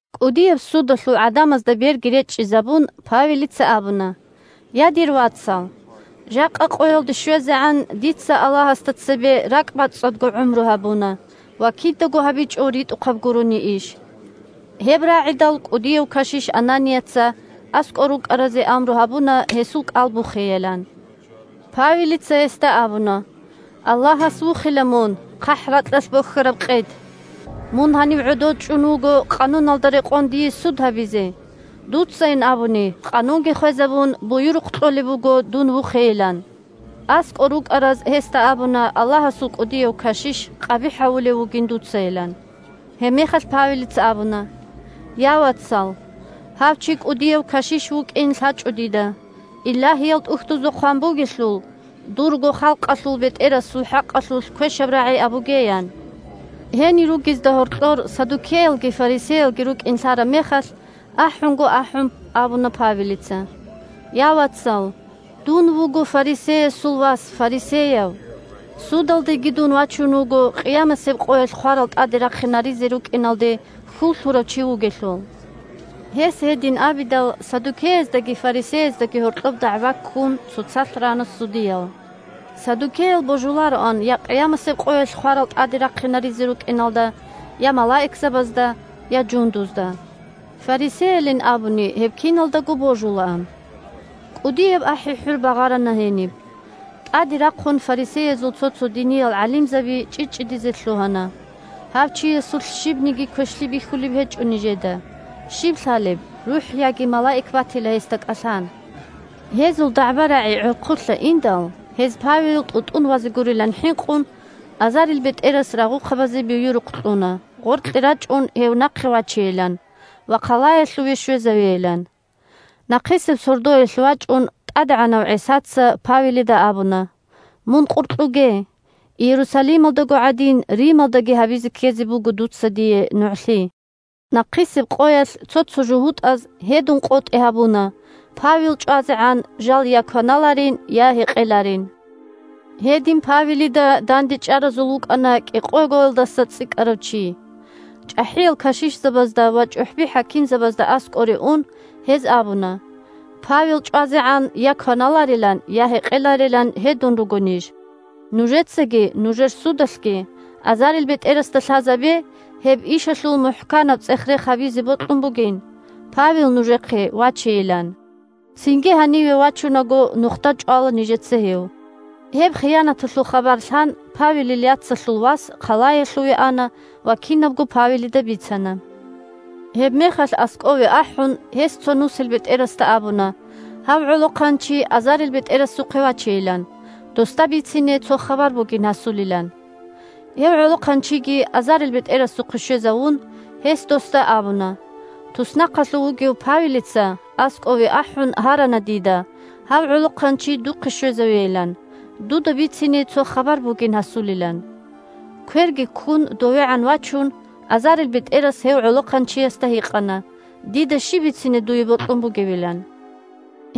КӀудияб судалъул гӀадамазда берги речӀчӀизабун, Павелица абуна: – Я, дир вацал! Жакъа къоялде щвезегӀан дица Аллагьасда цебе ракӀбацӀцӀадго гӀумру гьабуна ва кидаго гьабичӀо ритӀухъаб гурони иш. Гьеб рагӀидал кӀудияв кашиш Ананияца аскӀор рукӀаразе амру гьабуна гьесул кӀал бухейилан. Павелица гьесда абуна: – Аллагьас вухила мун, хъахӀракьалъ бохьараб къед! Мун гьанив гӀодов чӀун вуго къануналда рекъон дие суд гьабизе. Дуцайин абуни, къанунги хвезабун, буюрухъ кьолеб буго дун вухейилан. АскӀор рукӀараз гьесда абуна Аллагьасул кӀудияв кашиш къабихӀ гьавулев вугин дуцайилан. Гьебмехалъ Павелица абуна: – Я, вацал! Гьав чи кӀудияв кашиш вукӀин лъачӀо дида, Илагьиял ТӀухьдузда хъван бугелъул: «Дурго халкъалъул бетӀерасул хӀакъалъулъ квешаб рагӀи абуге», – ян. Гьенир ругезда гьоркьор саддукеялги фарисеялги рукӀин лъараб мехалъ, ахӀунго-ахӀун абуна Павелица: – Я, вацал! Дун вуго фарисеясул вас фарисеяв. Судалдеги дун вачун вуго къиямасеб къоялъ хварал тӀаде рахъинаризе рукӀиналде хьул лъурав чи вугелъул. Гьес гьедин абидал, саддукеяздаги фарисеяздаги гьоркьоб дагӀба ккун, цоцалъ рана судиял. (Саддукеял божулароан я къиямасеб къоялъ хварал тӀаде рахъинаризе рукӀиналда, я малаикзабазда, я жундузда. Фарисеялин абуни гьеб киналдаго божулаан.) КӀудияб ахӀи-хӀур багъарана гьениб. ТӀаде рахъун фарисеязул цо-цо диниял гӀалимзаби чӀчӀичӀчӀидизе лъугьана: – Гьав чиясулъ щибниги квешлъи бихьулеб гьечӀо нижеда. Щиб лъалеб, рухӀ яги малаик батила гьесда кӀалъан? Гьезул дагӀба-рагӀи гӀорхъулъа индал, гьез Павел тӀутӀун вазе гурилан хӀинкъун, азарилбетӀерас рагъухъабазе буюрухъ кьуна гъоркье рачӀун гьев нахъе вачейилан ва хъалаялъуве щвезавейилан. Нахъисеб сордоялъ вачӀун, ТӀадегӀанав ГӀисаца Павелида абуна: – Мун къуркьуге! Иерусалималдаго гӀадин, Рималдаги гьабизе ккезе буго дуца дие нугӀлъи. Нахъисеб къоялъ цо-цо жугьутӀаз гьедун къотӀи гьабуна Павел чӀвазегӀан жал я кваналарин, я гьекъеларин. Гьедин Павелида дандечӀаразул вукӀана кӀикъогоялдаса цӀикӀкӀарав чи. ЧӀахӀиял кашишзабазда ва чӀухӀби-хӀакимзабазда аскӀоре ун, гьез абуна: – Павел чӀвазегӀан я кваналарилан, я гьекъеларилан гьедун руго ниж. Нужецаги нужер судалъги азарилбетӀерасда лъазабе гьеб ишалъул мухӀканаб цӀех-рех гьабизе бокьун бугин, Павел нужехъе вачейилан. Цинги гьаниве вачунаго нухда чӀвала нижеца гьев. Гьеб хиянаталъул хабар лъан, Павелил яцалъул вас хъалаялъуве ана ва кинабго Павелида бицана. Гьебмехалъ аскӀове ахӀун гьес цо нусилбетӀерасда абуна гьав гӀолохъанчи азарилбетӀерасухъе вачейилан, досда бицине цо хабар бугин гьасулилан. Гьев гӀолохъанчиги азарилбетӀерасухъе щвезавун, гьес досда абуна: – Туснахъалъув вугев Павелица аскӀове ахӀун гьарана дида гьав гӀолохъанчи духъе щвезавейилан, дуда бицине цо хабар бугин гьасулилан. Кверги ккун довегӀан вачун, азарилбетӀерас гьев гӀолохъанчиясда гьикъана дида щиб бицине дуе бокьун бугебилан.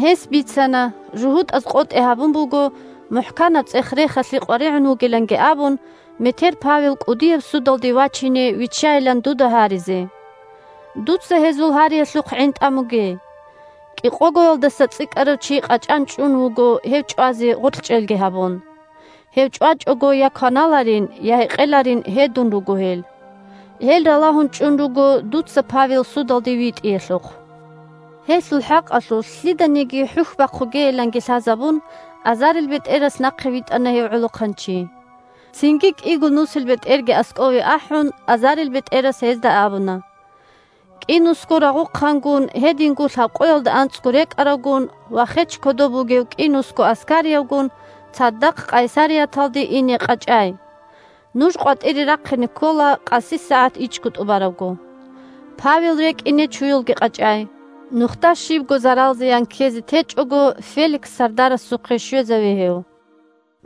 Гьес бицана: – ЖугьутӀаз къотӀи гьабун буго, мухӀканаб цӀех-рехалъе къваригӀун вугиланги абун, метер Павел кӀудияб судалде вачине виччайилан дуда гьаризе. Дуца гьезул гьариялъухъ гӀин тӀамуге. КӀикъогоялдаса цӀикӀкӀарав чи къачӀан чӀун вуго гьев чӀвазе гъоркьчӀелги гьабун. Гьев чӀвачӀого я кваналарин, я гьекъеларин гьедун руго гьел. Гьел ралагьун чӀун руго дуца Павел судалде витӀиялъухъ. Гьелъул хӀакъалъулъ лъиданиги хӀухь бахъугейиланги лъазабун, азарилбетӀерас нахъе витӀана гьев гӀолохъанчи. Цинги кӀиго нусилбетӀерги аскӀове ахӀун, азарилбетӀерас гьезда абуна: – КӀинусго рагъухъангун, гьединго лъабкъоялда анцӀго рекӀаравгун ва хеч кодоб бугев кӀинусго аскариявгун цадахъ Къайсарияталде ине къачӀай. Нуж къватӀире рахъине ккола къаси сагӀат ичӀго тӀубарабго. Павел рекӀине чуялги къачӀай. Нухда щибго зарал-зиян ккезе течӀого, Феликс сардарасухъе щвезаве гьев.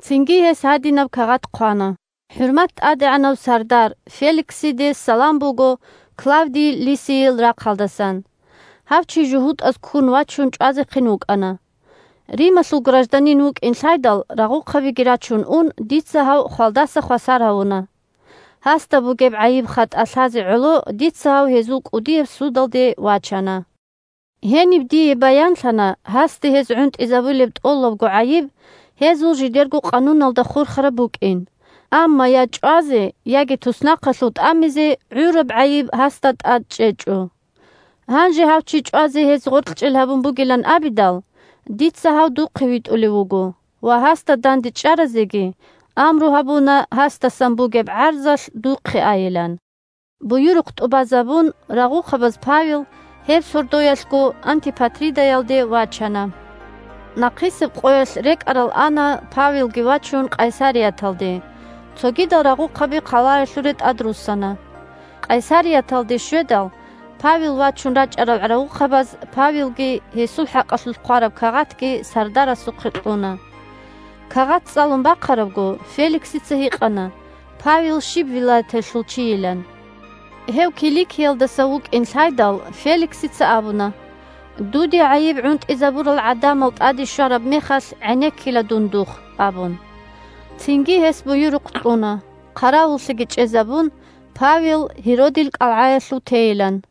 Цинги гьес гьадинаб кагъат хъвана: «ХӀурмат тӀадегӀанав сардар Феликсиде салам буго Клавдий Лисийил рахъалдасан. Гьав чи жугьутӀаз, ккун вачун, чӀвазехъин вукӀана. Рималъул гражданин вукӀин лъайдал, рагъухъабиги рачун ун, дица гьав хвалдаса хвасар гьавуна. Гьасда бугеб гӀайиб-хатӀа лъазе гӀоло дица гьав гьезул кӀудияб судалде вачана. Гьениб дие баянлъана гьасде гьез гӀунтӀизабулеб тӀолабго гӀайиб гьезул жидерго къануналда хурхараб букӀин, амма я чӀвазе, яги туснахъалъув тӀамизе гӀураб гӀайиб гьасда тӀад чӀечӀо. Гьанже гьав чи чӀвазе гьез гъоркьчӀел гьабун бугилан абидал, дица гьав духъе витӀулев вуго ва гьасда дандечӀаразеги амру гьабуна гьасдасан бугеб гӀарзалъ духъе айилан». Буюрухъ тӀубазабун, рагъухъабаз Павел гьеб сордоялъго Антипатридаялде вачана. Нахъисеб къоялъ рекӀарал ана Павелги вачун Къайсарияталде, цогидал рагъухъаби хъалаялъуре тӀадруссана. Къайсарияталде щведал, Павел вачун рачӀарал рагъухъабаз Павелги гьесул хӀакъалъулъ хъвараб кагъатги сардарасухъе кьуна. Кагъат цӀалун бахъарабго, Феликсица гьикъана Павел щиб вилаяталъул чийилан. Гьев Киликиялдаса вукӀин лъайдал, Феликсица абуна: – Дуде гӀайиб гӀунтӀизабурал гӀадамал тӀаде щвараб мехалъ гӀенеккила дун духъ, – абун. Цинги гьес буюрухъ кьуна, хъаравуллъиги чӀезабун, Павел Гьеродил кӀалгӀаялъув тейилан.